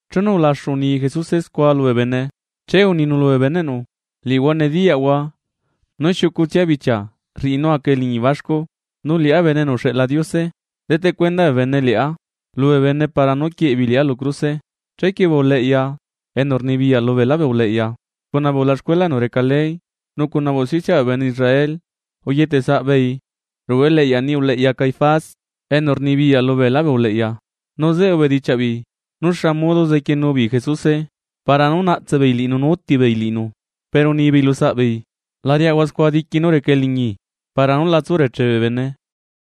Chenu ulaxu uni Jesuse scua lubee bene, che uninu lubee beneꞌnu: ―Liꞌihua nediyaꞌhua nú xiucutsia bichia rriꞌi nú aca eliñi baxcu, nu liꞌá Bene enu uxeꞌla Diose deteꞌ cuenda bene liꞌá lubee bene para nú quieꞌe beei liꞌá lu cruse. Chequie bee uleꞌya enu rnibiyaꞌ lubeelá bee uleꞌya, cuna bee ulaxcuela enu reca ley nu cuna bee usticiaꞌ bee bene Israel, uyetesaꞌ beei ruꞌu eleꞌya niꞌi uleꞌya Caifás enu rnibiyaꞌ lubeelá bee uleꞌya. Nu zeꞌe ubedichiaꞌ beei nú xa modo zequienu beei Jesuse para nú naꞌtse beei liꞌinu nú uti beei liꞌinu. Pero unibeei lusaꞌbeei: ―La riaꞌahua scua diqui nú reca eliñi para nú la tsu reche bee bene.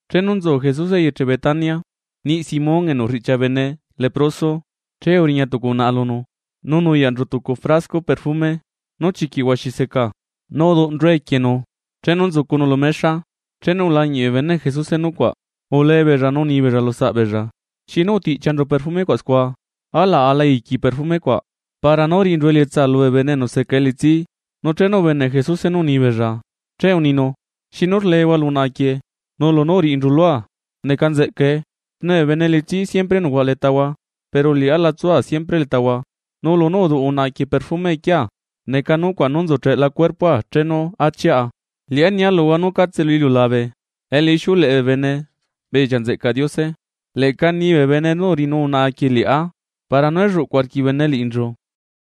Chenu nzu Jesuse eyeche Betania, niꞌ Simón enu riꞌchia bene leproso, che uriña tucu unaꞌa lunu nu nuyaꞌnchu tucu frasco perfume nú chiquiꞌ huaxi seca, nu uduꞌnchue equienu chenu nzucunu lu mexa. Chenu ulañiꞌ bee beneꞌ Jesuse nucuaꞌ, ulee beella nu unibeella lusaꞌbeella: ―¿Xinu utiꞌchianchu perfume cuaꞌ scua? Alaꞌ aꞌla aiqui perfumecuaꞌ para nú riꞌinchu elietsa lubee bene enu seca elitsi. Nu chenu ubeneꞌ Jesuse nú uni beella, che uninu: ―¿Xinu rlehua lu unaꞌa quieꞌ? Nu lunú uriꞌinchu lua neca nzeꞌcae. Xne bee bene elitsí siempre nucuaꞌa letahua, pero liꞌá la tsua siempre letahua. Nu lunú uduꞌ unaꞌa quieꞌ perfume equiea, neca nucuaꞌ nú nzucheꞌla cuerpoa chenu achiꞌa. Liꞌá nia luhua nu catse lu iliulabe elu ixiuleꞌe bee bene bedichiaꞌ nzeꞌcaꞌ Diose, leꞌca nibee bene nú uriꞌinu unaꞌa quieꞌ liꞌá, para nú elluꞌcu arquiꞌ bee bene liꞌinchu.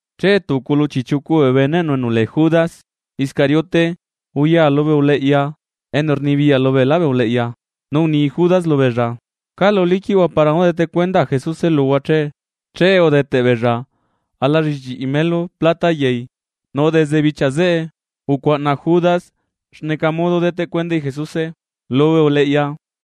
Che tucu lu chiꞌchiucu bee beneꞌnu enu lee Judas Iscariote, uya lubee uleꞌya enu rnibiyaꞌ lubeela bee uleꞌya, nu uni Judas lubeella: ―¿Calu liquiꞌhua para nú dete cuendaa Jesuse luhua che? Che udeteꞌbeella alallichiꞌi melu plata yai. Nu desde bichia zeꞌe ucuaꞌna Judas xneca modo deteꞌ cuendai Jesuse lubee uleꞌya.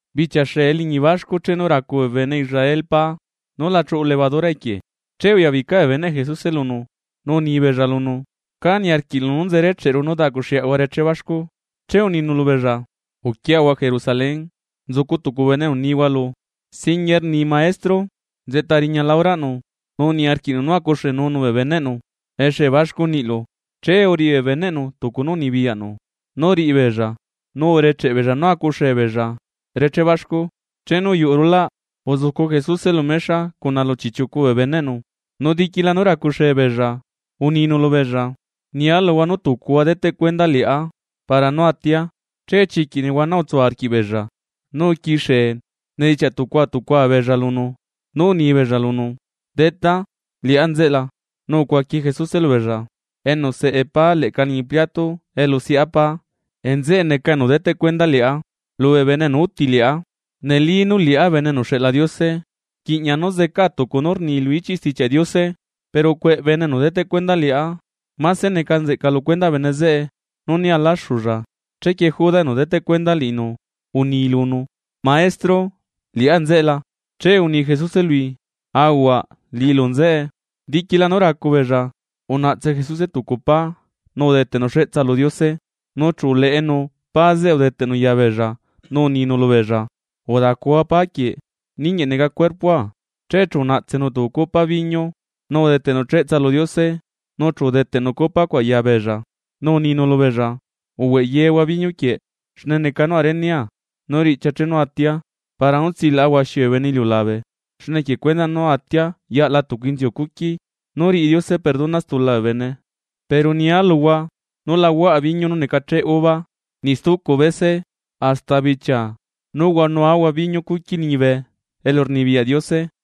Bichia xee eliñi baxcu chenu racu bee bene Israel pa nú la chuꞌu levadura equie, che uyabica bee beneꞌ Jesuse lunu, nu unibeella lunu: ―¿Cá niarquiꞌlu nú nzerecheꞌru nú daꞌcuxeꞌahua reché baxcu? Chequie uninu lubeella: ―Uquiahua Jerusalén, nzucu tucu bene enu nihua lu: “Singuie rni Maestro: Nzeꞌta riñala horaꞌnu, nu niarquiꞌnu nú acuxenunu bee beneꞌnu exee baxcu niꞌlu.” Che uriꞌi bee beneꞌnu tucu nú unibiyaꞌnu nú riꞌi beella, nu urecheꞌ beella nú acuxee beella reché baxcu. Chenu uyuꞌu rulaꞌ, uzucu Jesuse lu mexa cuna chiꞌchiucu bee beneꞌnu, nu diquila nú racuxee beella, uninu lubeella: ―Nia luhua nú tucuhua deteꞌ cuenda liꞌá para nú atia. Che chiquiꞌ nehuana utsu arquiꞌbeella nu uquixie unedichiaꞌ tucua tucua beella lunu, nu unibeella lunu: ―Detá, ¿liꞌá nzeꞌe la? Nu ucuaqui Jesuse lubeella: ―Enu seꞌe pa leꞌca liñi pliato elu seꞌa pa nzeꞌe neca enu deteꞌ cuenda liꞌá lubee bene enu uti liꞌá. Neli nú liꞌá Bene enu uxeꞌla Diose, rquiꞌña nú zecaa tucu nú rni lu ichiꞌ Stichiaꞌ Diose; pero ¡cueꞌ bene enu deteꞌ cuenda liꞌá! Máse neca nzeꞌca lu cuendaꞌ bene zeꞌe nú né alaxulla. Chequie Judas enu deteꞌ cuenda liꞌinu, uni lunu: ―Maestro, ¿liꞌá nzeꞌe la? Che uni Jesuse lui: ―Ahuaꞌ, liꞌilu nzeꞌe. Diquila nú racu beella, unaꞌtse Jesuse tucu pa nu udeteꞌnu cheꞌtsa lu Diose, nu chu uleꞌenu pa zeꞌe udeteꞌnu ya beella, nu uninu lubeella: ―Udacuhua pa quieꞌ, ninguieꞌ neca cuerpoa. Che chu unaꞌtsenu tucu copa biñu, nu udeteꞌnu cheꞌtsa lu Diose nu chu udeteꞌnu copa cuaꞌ ya beella, nu uninu lubeella: ―Uhueꞌ yehua biñu quieꞌ, xne neca nucuaꞌ renea nú riꞌchia chenu atia para nú tsilaꞌa huaxi bee bene iliulabe, xne equie cuendaꞌ nú atia yaꞌla tucu inziu cuqui nú riꞌi Diose perdona stula bee bene. Pero nia luhua nú la huaꞌa biñu nú necacheꞌe uva niꞌ stucu bese, hasta bichia nú huaꞌanuahua biñu cuqui liñibe elurnibiyaꞌ Diose.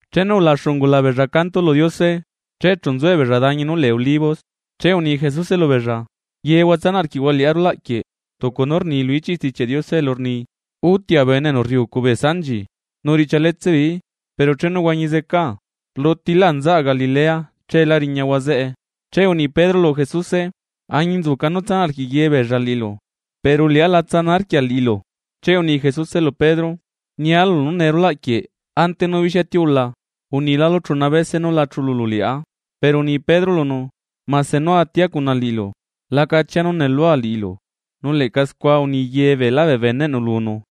Chenu ulaxu ungula beella canto lu Diose, che chu nzuebeella dañi nú lee Olivos. Che uni Jesuse lubeella: ―Yehua tsanaꞌ arquiꞌhua liꞌá rulaꞌ quieꞌ, tucu nú rni lu ichiꞌ Stichiaꞌ Diose elu rni: “Utia bene enu rriucu bee sanchi, nu riꞌchialetse beeií.” Pero chenu huañi zecaa, rlutilaa nzaꞌa Galilea, cheelá riñahua zeꞌe. Chequie uni Pedro lu Jesuse: ―Añinzuca nú tsanaꞌ arquiꞌ yebeella liꞌilu. Pero liꞌá la tsana arquia liꞌilu. Che uni Jesuse lu Pedro: ―Nia lulu nú nee rulaꞌ quieꞌ ante nú bixia tiula, unilalu chuna bese núla chululu liꞌá. Pero uni Pedro lunu: ―Mase nú atia cuna liꞌilu, la cachia nú nuꞌlua liꞌilu. Nu leꞌca scua uni ye beelá bee beneꞌnu lunu.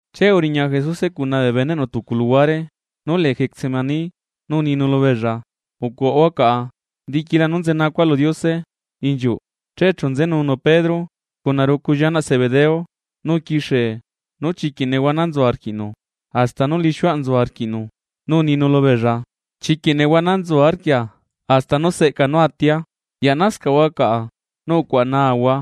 Che uriña Jesuse cuna bee beneꞌnu tucu luhuare nú lee Getsemaní, nu uninu lubeella: ―Ucuaꞌahua caꞌa, diquila nú nzenacua lu Diose inchiuꞌ. Che chu nzenunu Pedro cuna rucu llianaꞌ Zebedeo, nu uquixie nú chiquiꞌ nehuana nzu arquiꞌnu hasta nú lixiuaꞌ nzu arquiꞌnu, nu uninu lubeella: ―Chiquiꞌ nehuana nzu arquia hasta nú seꞌca nú atia, yaꞌnascaꞌhua caꞌa, nu ucuaꞌa naahua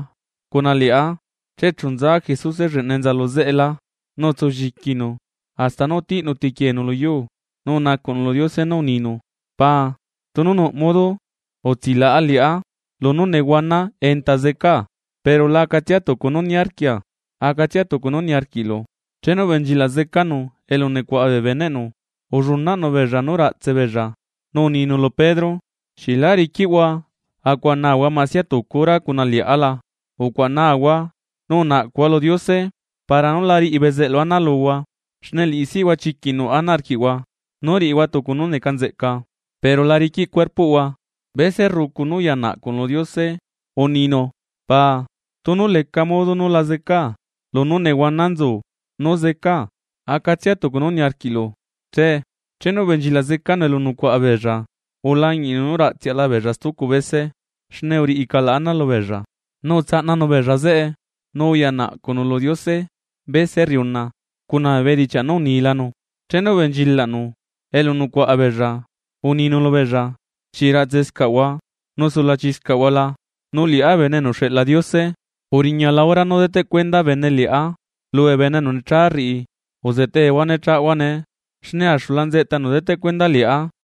cuna liꞌá. Che chu nza Jesuse lleꞌna enza lu zeꞌelá, nu utsu lliquinu hasta nú utiꞌnu tequienu lu yuu, nu unacuꞌnu lu Diose nú uninu: ―Paa, tunu nuꞌ modo utsilaꞌa liꞌá lunú nehuana enta zecaa, pero la acatsia tucu nú niarquia, acatsia tucu nú niarquiꞌlu. Chenu ubenchilaꞌ zecanu elu nucuaꞌa bee beneꞌnu, ullunaꞌnu beella nú raꞌtse beella, nu uninu lu Pedro: ―¿Xieꞌ lá riquiꞌhua acuaꞌanahua masia tucu hora cuna liꞌá la? Ucuaꞌa nahua nu unaꞌcuhua lu Diose para nú la riꞌi bezeꞌlu ana luhua. Xne liꞌisihua chiquiꞌ nuꞌ ana arquiꞌhua nú riꞌihua tucu nú neca nzeꞌca, pero la riquiꞌ cuerpoꞌhua. Bese rrucu nú uya naꞌcunu lu Diose uninu: ―Paa, tunu leca modo nu la zeca lunú nehuana nzu nú zecaa, acatsia tucu nú niarquiꞌlu che. Chenu ubenchilaꞌ zecanu elu nucuaꞌa beella, ulañiꞌnu nú raꞌtseaꞌla beella stucu bese xne uriꞌi calaꞌ ana lubeella. Nu utsaꞌnanu beella zeꞌe nu uya naꞌcuꞌnu lu Diose bese rriuna cuna bee bedichiaꞌ nú unilanu. Chenu ubenchilaꞌnu elu nucuaꞌa beella, uninu lubeella: ―¿Xieꞌ raꞌtsescaꞌhua nu sulachiscaꞌhua la? Nu liꞌá Bene enu uxeꞌla Diose, uriñala hora nú deteꞌ cuenda bene liꞌá lubee bene enu necha rriꞌi. Uzetehua ne chaꞌahua nee, xne axula nzeꞌta enu deteꞌ cuenda liꞌá.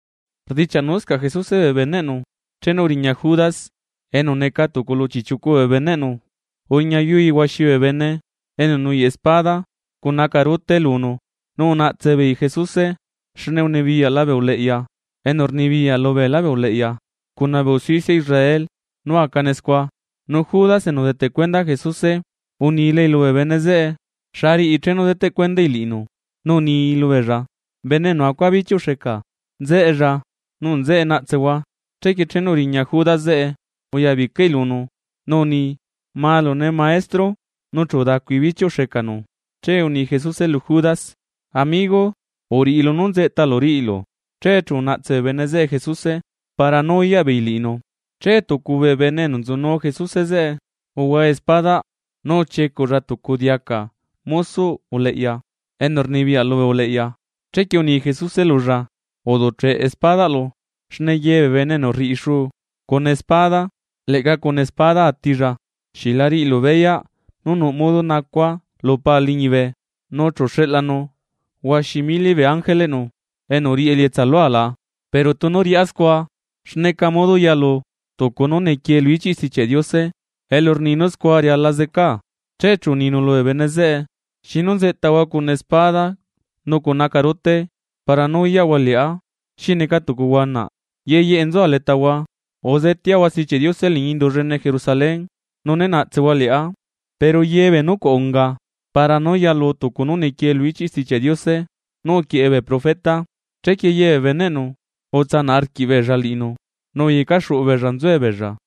Rdichiaꞌnuscaꞌ Jesuse bee beneꞌnu chenu uriña Judas, enu neca tucu lu chiꞌchiucu bee beneꞌnu, uriñayui huaxi bee bene enu nuyaꞌ espada cuna acarute lunu. Nu unaꞌtse beei Jesuse xne unibiyaꞌla bee uleꞌya enu rnibiyaꞌ lubeela bee uleꞌya cuna bee usticia Israel nú acane scua. Nu Judas enu udeteꞌ cuenda Jesuse unilai lubee bene zeꞌe xa riꞌi chenu deteꞌ cuendai liꞌinu, nu uni lubeella: ―Nee enu acua bichiuꞌ xeca, nzeꞌella nu nzeꞌe naꞌtsehua. Chequie chenu uriña Judas zeꞌe uya bicai lunu nu uni: ―¡Malune, Maestro! Nu chu udacui bichiuꞌ xecanu. Che uni Jesuse lu Judas: ―Amigo, uriꞌi lunú nzeꞌtalu riꞌilu. Che chu unaꞌtse bee bene zeꞌe Jesuse para nú uyaꞌ beei liꞌinu. Che tucu bee bene enu nzunu Jesuse zeꞌe uhua espadaꞌ nu uchiecuꞌlla tucu diaca mosoꞌ uleꞌya enu rnibiyaꞌ lubee uleꞌya. Chequie uni Jesuse lulla: ―Uduꞌcheꞌ espadaꞌlu xne ye bee bene enu rriꞌi xu cuna espada, leꞌca cuna espada atilla. ¿Xieꞌ la riꞌilu beyaꞌ nú nuꞌ modo nacua lu Paa liñibe, nu chu xeꞌlanu huaxi mili bee ángeleꞌnu enu riꞌi elietsa lua la? Pero tunu riꞌá scua, ¿xneca modo yalu tucu nú nequie lu ichiꞌ Stichiaꞌ Diose elu rni nú scua riala zecaa? Che chu uninu lubee bene zeꞌe: ―¿Xinu nzeꞌtahua cuna espada nu cuna acarute para nú uyaꞌhua liꞌá xi neca tucu huanaꞌ? Ye yeꞌe nzua letahua uzeteahua Stichiaꞌ Diose liñi indu llene Jerusalén, nu né naꞌtsehua liꞌá. Pero ye bee nucuaꞌ unga para nú yalu tucu nú nequie lu ichiꞌ Stichiaꞌ Diose nú uquieꞌe bee profeta. Chequie ye bee beneꞌnu utsanaꞌ arquiꞌbeella liꞌinu nu uyecaxuꞌu beella nzuebeella.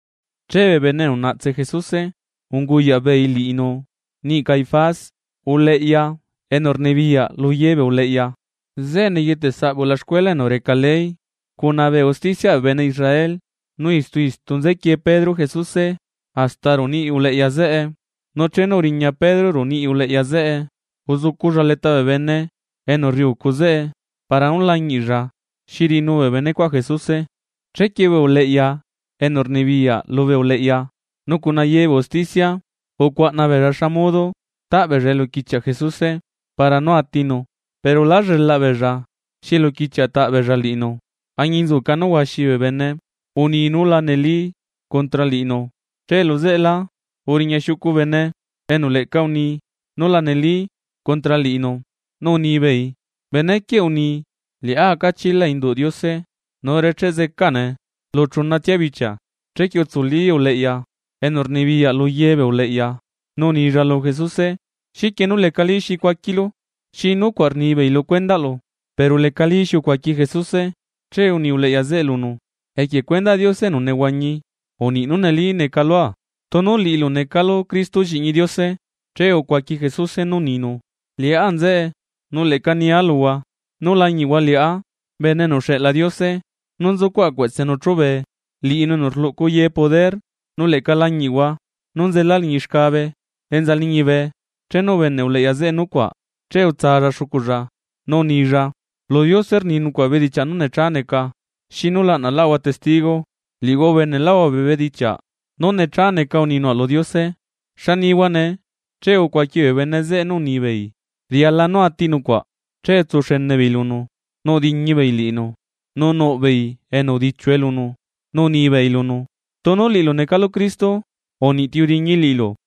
Che bee bene enu unaꞌtse Jesuse unguyaꞌ beei liꞌinu niꞌi Caifás, uleꞌya enu rnibiyaꞌ luye bee uleꞌya, zeꞌe neyeteꞌsaꞌ bee ulaxcuela enu reca ley cuna bee usticiaꞌ bee bene Israel. Nu istu istu nzequie Pedro Jesuse hasta ruꞌu niꞌi uleꞌya zeꞌe, nu chenu uriña Pedro ruꞌu niꞌi uleꞌya zeꞌe uzuculla leta bee bene enu rriucu zeꞌe para nú lañiꞌlla xi riꞌinu bee benecuaꞌ Jesuse. Chequie bee uleꞌya enu rnibiyaꞌ lubee uleꞌya, nu cuna ye bee usticia ucuaꞌna beella xa modo taꞌ beella eluquichiaꞌ Jesuse para nú atinu. Pero lá llelaꞌ beella xi eluquichiaꞌ ataꞌ beella liꞌinu añinzuca nú huaxi bee bene uni nú la neli contra liꞌinu, che luzeꞌelá uriña xiucu bene enu leꞌca uni nú la neli contra liꞌinu, nu unibeei: ―Benequieꞌ uni: “Liꞌá aca chila induꞌ Diose nu recheꞌ zecane lu chunatsia bichia.” Chequie utsuli uleꞌya enu rnibiyaꞌ lu ye bee uleꞌya nu unilla lu Jesuse: ―¿Xiquie nú lecalí xi cuaquilu? ¿Xi nucuaꞌ rnibeei lu cuendaꞌlu? Pero lecalí xi ucuaqui Jesuse. Che uni uleꞌya zeꞌe lunu: ―Equie cuendaꞌ Diose enu nehuañi, uniꞌi nú neli neca lua tunu liꞌilu necalu Cristo lliꞌñi Diose. Che ucuaqui Jesuse nú uninu: ―Liꞌá nzeꞌe. Nu leꞌca nia luhua nú lañiꞌhua liꞌá Bene enu uxeꞌla Diose nú nzucuaꞌa cueꞌtsenu chúbe, liꞌinu enu rluꞌcu ye poder, nu leꞌca lañiꞌhua nú nzela liñi xcabe enza liñibe. Chenu ubeneꞌ uleꞌya zeꞌe nucuaꞌ che utsalla xuculla, nu unilla: ―Lu Diose rni nucuaꞌ bedichiaꞌ nú necha neca, ¿xinu laꞌnaꞌláꞌahua testigo? Liꞌihua ubeneꞌláꞌhua bee bedichiaꞌ nú necha neca uni nucuaꞌ lu Diose. ¿Xa nihua nee? Che ucuaqui bee bene zeꞌe nú unibeei: ―Riala nú ati nucuaꞌ. Che utsuxene beei lunu nu udiñi beei liꞌinu, nu nuꞌ beei enu udichiue lunu. Nu unibeei lunu: ―Tunu liꞌilu necalu Cristo, ¡uniꞌ ti udiñi liꞌilu!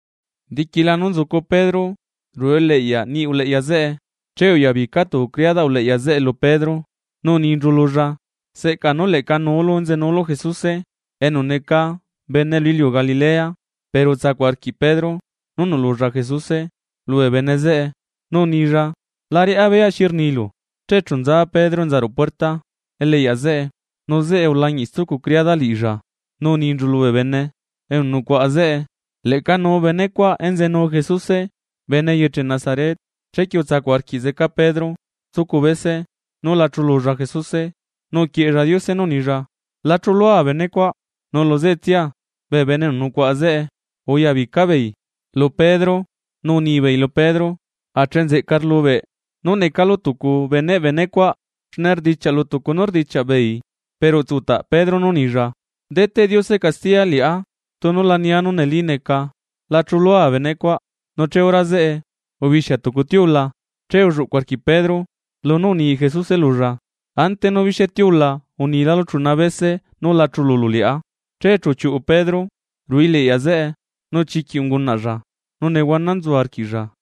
Diquila nú nzucu Pedro ruꞌu eliꞌyaꞌ niꞌi uleꞌya zeꞌe, che uyabica tucu criadaꞌ uleꞌya zeꞌe lu Pedro, nu uninchu lulla: ―Seꞌca nú leꞌca nuulu enzenuulu Jesuse enu neca bene lu iliu Galilea. Pero utsacuꞌ arquiꞌ Pedro nú nuꞌlulla Jesuse lubee bene zeꞌe, nu unilla: ―La riꞌá beya xi rnilu. Che chu nza Pedro enza ruꞌu puerta eliꞌyaꞌ zeꞌe, nu zeꞌe ulañiꞌ stucu criada liꞌilla nu uninchu lubee bene enu nucuaꞌa zeꞌe: ―Leꞌca nuu benecuaꞌ enzenu Jesuse bene eyeche Nazaret. Chequie utsacuꞌ arquiꞌ zeca Pedro stucu bese nú la chululla Jesuse, nu uquieꞌella Diose nú unilla: ―La chulua benecuaꞌ. Nu luzeꞌetsia bee bene enu nucuaꞌa zeꞌe uyabica beei lu Pedro, nu unibeei lu Pedro: ―Ache nzeꞌca rlubeꞌ nú necalu tucu beneꞌ bene cuaꞌ, xne rdichiaꞌlu tucu nú rdichiaꞌ beei. Pero utsutaꞌ Pedro nú unilla: ―Deteꞌ Diose castiya liꞌá tunu la nia nú neli neca la chulua bene cuaꞌ. Nu che hora zeꞌe ubixia tucu tiula. Che ulluꞌcuꞌ arquiꞌ Pedro lunú uni Jesuse lulla: “Ante nú bixia tiula unilálu chuna bese nú la chululu liꞌá.” Che chu uchiuꞌu Pedro ruꞌu eliꞌyaꞌ zeꞌe nu chiquiꞌ ungunaꞌlla nú nehuana nzu arquiꞌlla.